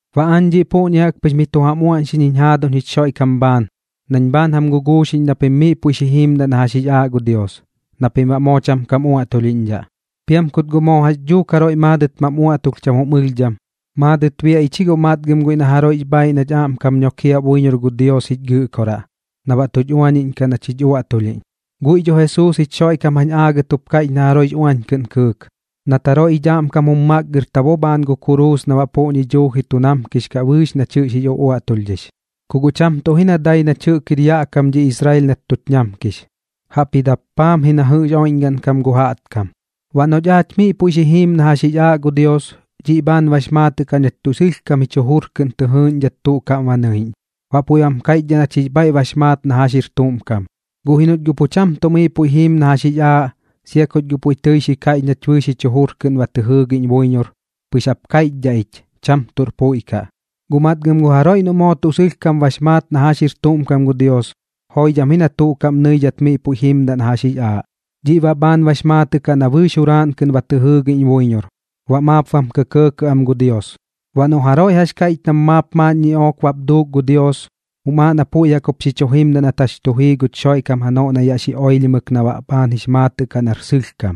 Baꞌ aañ dhiꞌ puꞌñi jaꞌk pɨx miꞌ tu jam uaꞌñxiꞌñ jiñ jaaduñ jich Xoiꞌkam bhaan nañ bhaan jam guguuxiꞌñ na pim miꞌ puiꞌ xi jiimdaꞌ na jax jix aaꞌ gu Dios, na pim baꞌ moo cham kam uaꞌtulhiꞌñdhaꞌ. Piam kut guꞌ moo jax dhuuk jaroiꞌ maadɨt mam uaꞌtulh cham jum ɨlhdham, maadɨt biaꞌ ich ji guꞌ matgɨm guiꞌ na jaroiꞌx bhaaiꞌ nach aꞌmkam nokiaꞌ buiñor gu Dios jich Gɨꞌkoraꞌ, na baꞌ tuch uañiꞌñkaꞌ nach jich uaꞌtulhiꞌñ. Guiꞌ dho Jesuus jich Xoiꞌkam jañ aagɨt jup kaiꞌch na jaroiꞌx uañ kɨꞌn kɨɨk, nat jaroiꞌ jich aꞌmkam jum makgɨrta bo janoꞌ bhaan gu kuruus na baꞌ puꞌñi dhuuji tu namkix kaꞌ bɨɨx nach jɨꞌx jix uaꞌtulhdhix. Ku guꞌ cham tuꞌ ji na dai nach jɨꞌk jir yaꞌ kam dhi Israel nat tuch ñamkix, jaꞌpji dappaam ji na jɨꞌx oiꞌñgaꞌn kam gu jaꞌtkam. Baꞌ noꞌch miꞌ puiꞌ xi jiim na jax jix aaꞌ gu Dios, dhiꞌ bhaan bax maatɨꞌ kaꞌ nach tuꞌ sɨlhkam bɨɨx jich jujur kɨꞌn tɨ jɨɨꞌñdhat tuꞌ kaꞌm ba nɨiꞌñ, baꞌ puiꞌ bam kaiꞌchdhaꞌ nach jix bhaiꞌ bax maat na jax jir tuꞌm kam. Guꞌ ji noꞌch guꞌ pu cham tuꞌ miꞌ puiꞌ jiim na jax jix aaꞌ, sia kuch guꞌ puiꞌ tɨi xi kaiꞌch nach bɨɨx jich jujur kɨꞌn ba tɨ jɨɨgiꞌñ buiñor, pɨx jap kaiꞌchdhaꞌ ich, cham tuꞌr puiꞌ kaꞌ. Guꞌ matgɨm gu jaroiꞌ noꞌt moo tuꞌ sɨlhkam ba maat na jax jir tuꞌm kam gu Dios, joidham ji na tuꞌ kaꞌm nɨidhat miꞌ puiꞌ jimdaꞌ na jax jix aaꞌ. Dhiꞌ baꞌ bhaan bax maatɨꞌ kaꞌ na bɨɨx juraaꞌn kɨꞌn ba tɨ jɨɨgiꞌñ buiñor, baꞌ maap bam kɇkɇɇ am gu Dios. Baꞌ noꞌ jaroiꞌ jax kaiꞌch nam maap maaꞌn ñiꞌook bap duuk gu Dios, jum aaꞌ na puiꞌ jaꞌk jup xi chu jimdaꞌ nat jax tu jii guch Xoiꞌkam janoꞌ na yaꞌ xi oilhimɨk na baꞌ bhaan jix maatɨꞌ kaꞌ nar sɨlhkam.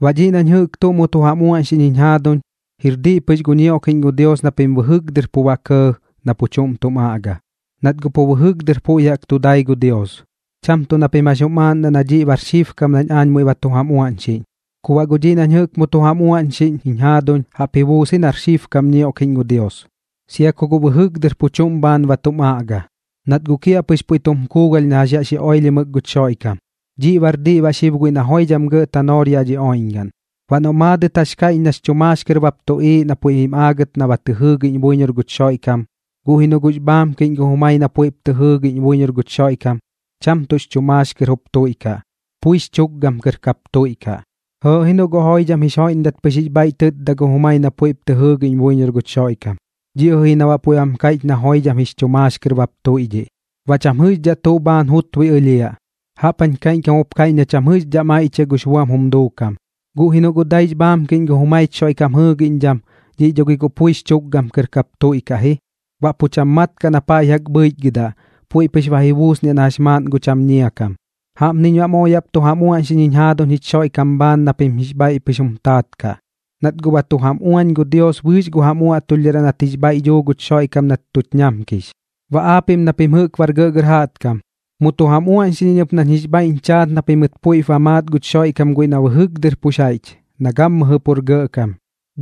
Baꞌ dhiꞌ nañ jɨꞌk tuꞌ mu tu jam uaꞌñxiꞌñ jiñ jaaduñ, jir diꞌ pɨx gu ñioꞌkiꞌñ gu Dios na pim bɨjɨk dɨr pu ba kɇɇ na pu chuꞌm tum aꞌga, nat pu bɨjɨk dɨr puiꞌ jaꞌk tu dai gu Dios. Cham tuꞌ na pim jax jum aaꞌndaꞌ na dhiꞌ baꞌ bar xibkam nañ aañ muiꞌ ba tu jam uaꞌñxiꞌñ. Ku baꞌ guꞌ dhiꞌ nañ jɨꞌk tuꞌ mu tu jam uaꞌñxiꞌñ jiñ jaaduñ, jaꞌp ji buus ji nar xibkam ñioꞌkiꞌñ gu Dios, sia ku guꞌ bɨjɨk dɨr pu chuꞌm bhaan ba tum aꞌga, nat guꞌ kiaꞌpɨx puiꞌ tum kuugalh na jax yaꞌ xi oilhimɨk guch Xoiꞌkam. Dhiꞌ baꞌr diꞌ baꞌ xib guiꞌ na joidham gɇꞌ tanoor yaꞌ dhi oiꞌñgaꞌn. Baꞌ noꞌ guꞌ maadɨt jax kaiꞌch nax chu maax kɨr bap tuꞌiiꞌ na puiꞌ jim aagɨt na ba tɨ jɨɨgiꞌñ buiñor guch Xoiꞌkam, guꞌ ji noꞌ guꞌx bhaamkiꞌñ gu jumai na puiꞌp tɨ jɨɨgiꞌñ buiñor guch Xoiꞌkam, cham tuꞌx chu maax kɨr jup tuiꞌkaꞌ, puix chukgam kɨr kap tuiꞌkaꞌ. Jɨɨꞌ ji noꞌ guꞌ joidham jix joiꞌndat pɨx jix bhaiꞌ tɨtda gu jumai na puiꞌp tɨ jɨɨgiꞌñ buiñor guch Xoiꞌkam, dhiꞌ jɨꞌ ji na baꞌ puiꞌ bam kaiꞌch na joidham jix chu maax kɨr bap tuiꞌdhiꞌ, baꞌ cham jɨꞌxdhaꞌ tuꞌ bhaan jutbui ɨlhiaꞌ. Jaꞌp jañ kaiꞌñkam jup kaiꞌch na cham jɨꞌxdhaꞌ maiꞌchiaꞌ gux buam jum duukam. Guꞌ ji noꞌ guꞌ daix bhaamkiꞌñ gu jumaich Xoiꞌkam jɨɨgiꞌñdham, dhiꞌ dho gi guꞌ puix chu tukgam kɨr jup tuiꞌkaꞌ ji, baꞌ pu cham mat kaꞌ na paiꞌ jaꞌk bhɨichgɨdaꞌ, puiꞌ pɨx ba ji buusniaꞌ na jax maaꞌn gu cham ñiakam. Jaꞌpniñ baꞌ moo yaꞌp tu jam uaꞌñxiꞌñ jiñ jaaduñ jich Xoiꞌkam bhaan na pim jix bhaiꞌ pɨx jum taat kaꞌ, nat guꞌ ba tu jam uañ gu Dios bɨɨx gu jam uaꞌtulhdharaꞌ nat jix bhaiꞌ duu guch Xoiꞌkam nat tuch ñamkix. Baꞌ aapiꞌm na pim jɨꞌk bar gɇꞌgɇr jaꞌtkam, mu tu jam uaꞌñxiꞌñ iñ ɨp nañ jix bhaiꞌñ chaat na pimɨt puiꞌp ba maat guch Xoiꞌkam guiꞌ na bɨjɨk dɨr pux jaiꞌch, na gammɨjɨ pur gɇꞌkam.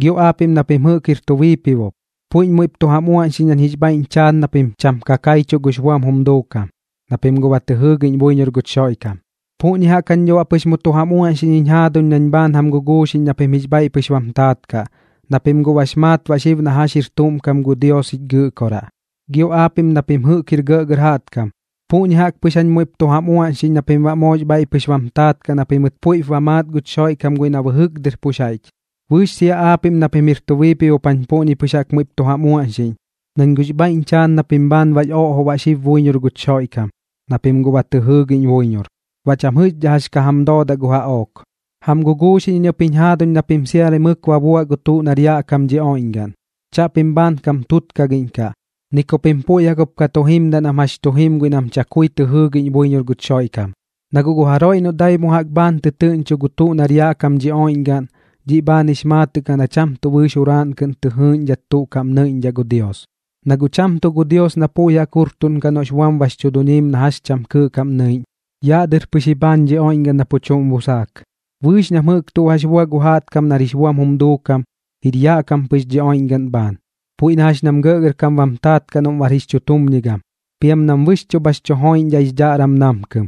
Gio aapiꞌm na pim jɨꞌk jir tu biipibop, puiꞌñ muiꞌp tu jam uaꞌñxiꞌñ nañ jix bhaiꞌñ chaat na pim cham ka kaichuꞌ gux buam jum duukam, na pim guꞌ ba tɨ jɨɨgiꞌñ buiñor guch Xoiꞌkam. Puꞌñi jaꞌk jañ dho baꞌ pɨx tu jam uaꞌñxiꞌñ jiñ jaaduñ nañ bhaan jam guguuxiꞌñ na pim jix bhaiꞌ pɨx bam taat kaꞌ, na pim guꞌ bax maat baꞌ xib na jax jir tuꞌm kam gu Dios jich Gɨꞌkoraꞌ. Gio aapiꞌm na pim jɨꞌk jir gɇꞌgɇr jaꞌtkam, puꞌñi jaꞌk pɨx jañ muiꞌp tu jam uaꞌñxiꞌñ na pim baꞌ moox bhaiꞌ pɨx jup bam taat kaꞌ na pimɨt puiꞌp ba maat guch Xoiꞌkam guiꞌ na bɨjɨk dɨr pux jaiꞌch. Bɨɨx sia aapiꞌm na pim jir tu biipibop jañ puꞌñi pɨx jaꞌk muiꞌp tu jam uaꞌñxiꞌñ, nañ guꞌx bhaiꞌñ chaat na pim bhaan bax oꞌjoꞌ baꞌ xib buiñor guch Xoiꞌkam, na pim guꞌ ba tɨ jɨɨgiꞌñ buiñor, baꞌ cham jɨꞌxdhaꞌ jax ka jam doodaꞌ gu jaꞌook. Jam guguuxiꞌñ iñ ɨp jiñ jaaduñ na pim siamri mɨk ba buaꞌ gu tuꞌ nar yaꞌ kam dhi oiꞌñgaꞌn. Chaꞌpim bhaan kam tutkagiꞌñkaꞌ, ni ku pim puiꞌ jaꞌk jup ka tu jimdaꞌ nam jax tu jim guiꞌ nam chakui tɨ jɨɨgiꞌñ buiñor guch Xoiꞌkam. Na guꞌ gu jaroiꞌ noꞌ dai mu jaꞌk bhaan tɨtɨɨꞌñcho gu tuꞌ nar yaꞌ kam dhi oiꞌñgaꞌn, dhiꞌ bhaan jix maatɨꞌ kaꞌ na cham tuꞌ bɨɨx juraaꞌn kɨꞌn tɨ jɨɨꞌñdhat tuꞌ kaꞌm nɨiꞌñdhaꞌ gu Dios. Na guꞌ cham tuꞌ gu Dios na puiꞌ jaꞌk jurtuꞌnkaꞌ noꞌx buam bax chu duñiim na jax cham kɨɨꞌ kaꞌm nɨiꞌñ, yaꞌ dɨr pɨx ji bhaan dhi oiꞌñgaꞌn na pu chuꞌm busaak. Bɨɨx nam jɨꞌk tuꞌ jax bua gu jaꞌtkam nar jix buam jum duukam, jir yaꞌ kam pɨx dhi oiꞌñgaꞌn bhaan, puiꞌ na jax nam gɇꞌgɇrkam bam taat kaꞌ noꞌm bar jix chutumñigam, piam nam bɨxchuꞌ bhax chu joiꞌñdhaꞌ jix dhaꞌram namkɨm,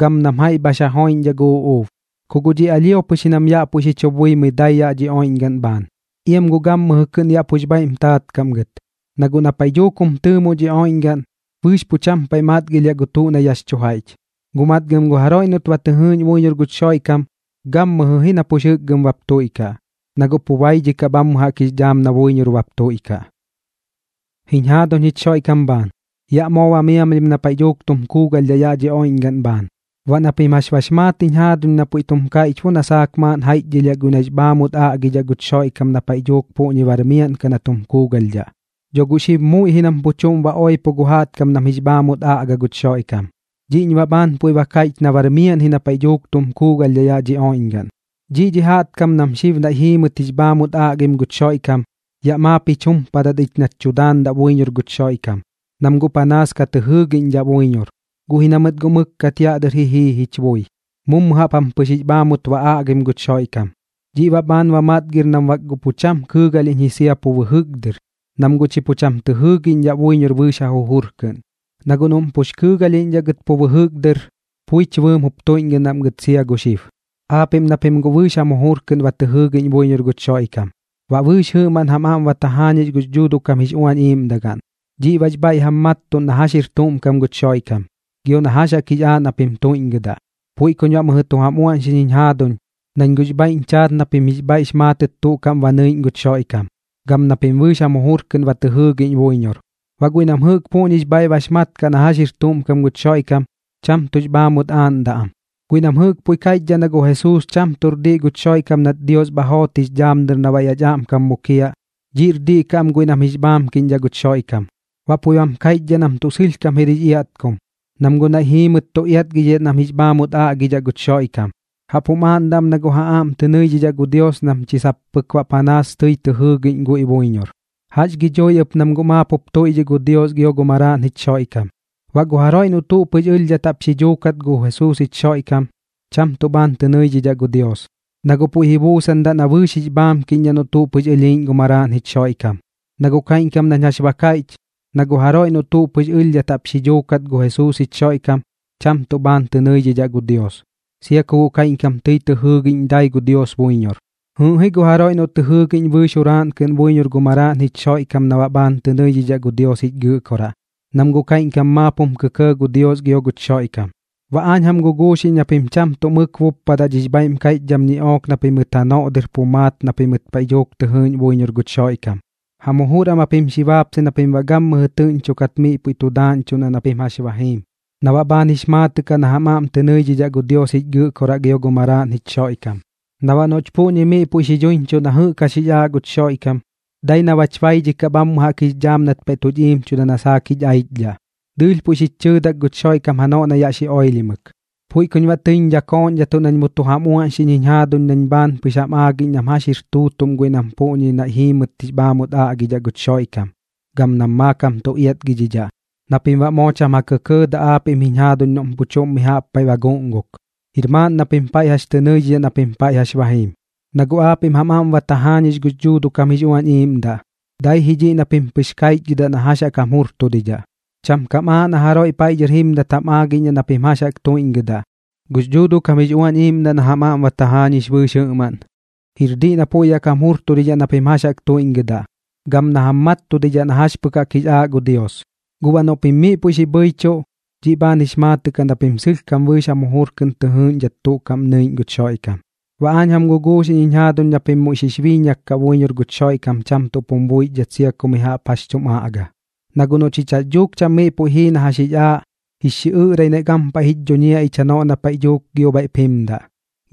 gam nam jaiꞌ bhax ja joiꞌñdhaꞌ gu uꞌuub. Ku guꞌ dhiꞌ alhio pɨx ji nam yaꞌ puiꞌ xi chu buimɨi dai yaꞌ dhi oiꞌñgaꞌn bhaan, iam guꞌ gammɨjɨ kɨꞌn yaꞌ pux bhaiꞌm taat kaꞌ am gɨt. Na guꞌ na paiꞌ dhuuk jum tɨɨmoꞌ dhi oiꞌñgaꞌn, bɨɨx pu cham paiꞌ matgilhiaꞌ gu tuꞌ na yaꞌx chu jaiꞌch. Guꞌ matgɨm gu jaroiꞌ noꞌt ba tɨ jɨɨꞌñ buiñor guch Xoiꞌkam, gammɨjɨ ji na pux jɨkgɨm bap tuiꞌkaꞌ, na guꞌ pu baidhikaꞌ bhammɨ jaꞌk jix dhaam na buiñor bap tuiꞌkaꞌ. Jiñ jaaduñ jich Xoiꞌkam bhaan, yaꞌ moo ba miamlhim na paiꞌ dhuuk tum kuugalhdhaꞌ yaꞌ dhi oiꞌñgaꞌn bhaan. Baꞌ na pim jax bax maat jiñ jaaduñ na puiꞌ tum kaiꞌch bo na saak maaꞌn jaiꞌchdhɨlhiaꞌ guiꞌ nax bhaamut aꞌgidhaꞌ guch Xoiꞌkam na paiꞌ dhuuk puꞌñi bar miaꞌn kaꞌ na tum kuugalhdhaꞌ. Dho guꞌ xib muiꞌ ji nam pu chuꞌm ba oipo gu jaꞌtkam nam jix bhaamut aꞌga guch Xoiꞌkam. Dhiꞌñ baꞌ bhaan puiꞌ ba kaiꞌch na bar miaꞌn ji na paiꞌ dhuuk tum kuugalhdhaꞌ yaꞌ dhi oiꞌñgaꞌn. Dhiꞌ dhi jaꞌtkam nam xib naiꞌ jiimɨt jix bhaamut aꞌgim guch Xoiꞌkam, yaꞌ maap jich jumpadat ich nach chu daandat buiñor guch Xoiꞌkam, nam guꞌ panaas ka tɨ jɨɨgiꞌñdhaꞌ buiñor. Guꞌ ji na mɨt guꞌ mɨkkat yaꞌ dɨr ji jii jich bui, mummu jaꞌp jam pɨx jix bhaamut ba aꞌgim guch Xoiꞌkam. Dhiꞌ baꞌ bhaan ba matgir nam bak guꞌ pu cham kɨɨgalhiꞌñ ji sia pu bɨjɨk dɨr, nam guꞌ chi pu cham tɨ jɨɨgiꞌñdhaꞌ buiñor bɨɨx ja jujur kɨꞌn. Na guꞌ noꞌm pux kɨɨgalhiꞌñdhaꞌ gɨt pu bɨjɨk dɨr, puich bɨɨm jup tuiꞌñgɨdaꞌm gɨt sia gu xib. Aapiꞌm na pim guꞌ bɨɨx jam jujur kɨꞌn ba tɨ jɨɨgiꞌñ buiñor guch Xoiꞌkam, baꞌ bɨɨx jɨꞌmaꞌn jam aꞌm ba tajaañix gux Dhuuduꞌ kam jix Uañ Iiꞌmdagaꞌn. Dhiꞌ bax bhaiꞌ jam mattuꞌn na jax jir tuꞌm kam guch Xoiꞌkam, gio na jax jaꞌk jix aaꞌ na pim tuiꞌñgɨdaꞌ. Puiꞌ kuñ baꞌ mɨjɨ tu jam uaꞌñxiꞌñ jiñ jaaduñ, nañ guꞌx bhaiꞌñ chaat na pim jix bhaiꞌx maatɨt tuꞌ kaꞌm ba nɨiꞌñ guch Xoiꞌkam, gam na pim bɨɨx jam jujur kɨꞌn ba tɨ jɨɨgiꞌñ buiñor. Baꞌ guiꞌ nam jɨꞌk puꞌñix bhaiꞌ bax mat kaꞌ na jax jir tuꞌm kam guch Xoiꞌkam, cham tuꞌx bhaamut aaꞌndaꞌ am. Guiꞌ nam jɨꞌk puiꞌ kaiꞌchdhaꞌ na gu Jesuus cham tuꞌr diꞌ guch Xoiꞌkam nat Dios bha joot jix dhaam dɨr na baꞌ yaꞌch aꞌmkam mukiaꞌ, dhiꞌr diꞌ kaꞌ am guiꞌ nam jix bhaamkiꞌñdhaꞌ guch Xoiꞌkam. Baꞌ puiꞌ bam kaiꞌchdhaꞌ nam tuꞌ sɨlhkam jir jix iatkum kaꞌ, nam guꞌ naiꞌ jiimɨt tu iatgidhidhaꞌ nam jix bhaamut aꞌgidhaꞌ guch Xoiꞌkam, jaꞌp jum aaꞌndaꞌ am na guꞌ ja aꞌm tɨ nɨidhidhaꞌ gu Dios nam chi sap pɨk baꞌ panaas tɨi tɨ jɨɨgiꞌñ guiꞌ buiñor. Jax gi dhui ɨp nam guꞌ maap jup tuiꞌdhiꞌ gu Dios gio gu Maraaꞌn jich Xoiꞌkam. Baꞌ gu jaroiꞌ noꞌ tuꞌ pɨx ɨlhdhat jaꞌp xi dhuukat gu Jesuus jich Xoiꞌkam, cham tuꞌ bhaan tɨ nɨidhidhaꞌ gu Dios, na guꞌ puiꞌ ji buusandaꞌ na bɨɨx jix bhaamkiꞌñdhaꞌ noꞌ tuꞌ pɨx ɨlhiiꞌñ gu Maraaꞌn jich Xoiꞌkam. Na guꞌ kaiꞌñkam nañ jax ba kaiꞌch, na gu jaroiꞌ noꞌ tuꞌ pɨx ɨlhdhat jaꞌp xi dhuukat gu Jesuus jich Xoiꞌkam, cham tuꞌ bhaan tɨ nɨidhidhaꞌ gu Dios, sia ku guꞌ kaiꞌñkam tɨi tɨ jɨɨgiꞌñ dai gu Dios buiñor. Jɨɨꞌ ji gu jaroiꞌ noꞌ tɨ jɨɨgiꞌñ bɨɨx juraaꞌn kɨꞌn buiñor gu Maraaꞌn jich Xoiꞌkam na baꞌ bhaan tɨ nɨidhidhaꞌ gu Dios jich Gɨꞌkoraꞌ, nam guꞌ kaiꞌñkam maap jum kɇkɇɇ gu Dios gio guch Xoiꞌkam. Baꞌ aañ jam guguuxiꞌñ na pim cham tuꞌ mɨk buppadaꞌ dhix bhaiꞌm kaiꞌchdham ñiꞌook na pimɨt janoꞌ dɨr pu maat na pimɨt paiꞌ dhuuk tɨ jɨɨꞌñ buiñor guch Xoiꞌkam. Jam jujur am japim xi baapsai na pim baꞌ gammɨjɨ tɨꞌñchokat miꞌ puiꞌ tu daaꞌñchuꞌndaꞌ na pim jax ba jiim, na baꞌ bhaan jix maatɨꞌ kaꞌ na jam aꞌm tɨ nɨidhidhaꞌ gu Dios jich Gɨꞌkoraꞌ gio gu Maraaꞌn jich Xoiꞌkam. Na baꞌ noꞌch puꞌñi miꞌ puiꞌ xi dhuiñchuꞌ na jɨꞌk jax jix aaꞌ guch Xoiꞌkam, dai na bach baidhikaꞌ bhammɨ jaꞌk jix dhaam nat paiꞌ tuch iimchuda na saak jich aichdhaꞌ. Dɨɨlh puiꞌ xich chɨɨdak guꞌ guch Xoiꞌkam janoꞌ na yaꞌ xi oilhimɨk. Puiꞌ kuñ baꞌ tɨiñ dhakooꞌñdhatuꞌ nañ mu tu jam uaꞌñxiꞌñ jiñ jaaduñ nañ bhaan pɨx jam aagiꞌñ nam jax jir tuutuꞌm guiꞌ nam puꞌñi naiꞌ jiimɨt jix bhaamut aꞌgidhaꞌ guch Xoiꞌkam, gam nam maakam tu iatgidhidhaꞌ, na pim baꞌ moo cham ja kɇkɇɇdaꞌ aapiꞌm jiñ jaaduñ noꞌm pu chuꞌm mi jaꞌp paiꞌ ba guꞌnguk, jir maaꞌn na pim jax tɨ nɨidhidhaꞌ na pim paiꞌ jax ba jiim. Na guꞌ aapiꞌm jam aꞌm ba tajaañix gux Dhuuduꞌ kam jix Uañ Iiꞌmdaꞌ, dai dhiꞌ ji na pim pɨx kaichgɨdaꞌ na jax jaꞌk jam jurtudidhaꞌ. Cham kam aaꞌ na jaroiꞌ paiꞌ dhɨr jimdat jam aagiꞌñdhaꞌ na pim jax jaꞌk tuiꞌñgɨdaꞌ. Gux Dhuuduꞌ kam jix Uañ Iiꞌmdaꞌ na jam aꞌm ba tajaañix bɨɨx jɨꞌmaꞌn, jir diꞌ na puiꞌ jaꞌk jam jurtudidhaꞌ na pim jax jaꞌk tuiꞌñgɨdaꞌ, gam na jam mattudidhaꞌ na jax pɨk jaꞌk jix aaꞌ gu Dios. Guꞌ baꞌ noꞌ pim miꞌ puiꞌ xi bhɨichuꞌ, dhiꞌ bhaan jix maatɨꞌ kaꞌ na pim sɨlhkam bɨɨx jam jujur kɨꞌn tɨ jɨɨꞌñdhat tuꞌ kaꞌm nɨiꞌñ guch Xoiꞌkam. Baꞌ aañ jam guguuxiꞌñ jiñ jaaduñ na pim muiꞌ xix biiñak kaꞌ buiñor guch Xoiꞌkam cham tuꞌp jum buixdhat sia ku mi jaꞌp jax tum aꞌga. Na guꞌ noꞌ chich jax dhuuk cham miꞌ puiꞌ jii na jax jix aaꞌ, jix xiꞌɨꞌrai naiꞌ gampaiꞌ jich dhuñiaꞌ ich janoꞌ na paiꞌ dhuuk gio bhaiꞌp jimdaꞌ.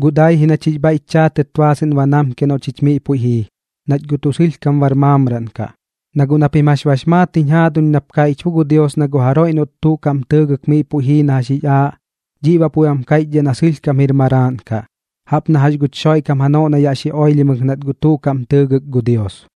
Guꞌ dai ji nach jix bhaiꞌch chaatɨt baasɨꞌn ba namkiaꞌ noꞌ chich miꞌ puiꞌ jii, nach guꞌ tuꞌ sɨlhkam bar maamraꞌn kaꞌ. Na guꞌ na pim jax bax maat jiñ jaaduñ nap kaiꞌch bo gu Dios na gu jaroiꞌ noꞌt tuꞌ kaꞌm tɨɨgɨk miꞌ puiꞌ jii na jax jix aaꞌ, dhiꞌ baꞌ puiꞌ bam kaiꞌchdhaꞌ na sɨlhkam jir maraaꞌn kaꞌ, jaꞌp na jax guch Xoiꞌkam janoꞌ na yaꞌ xi oilhimɨk nat guꞌ tuꞌ kaꞌm tɨɨgɨk gu Dios.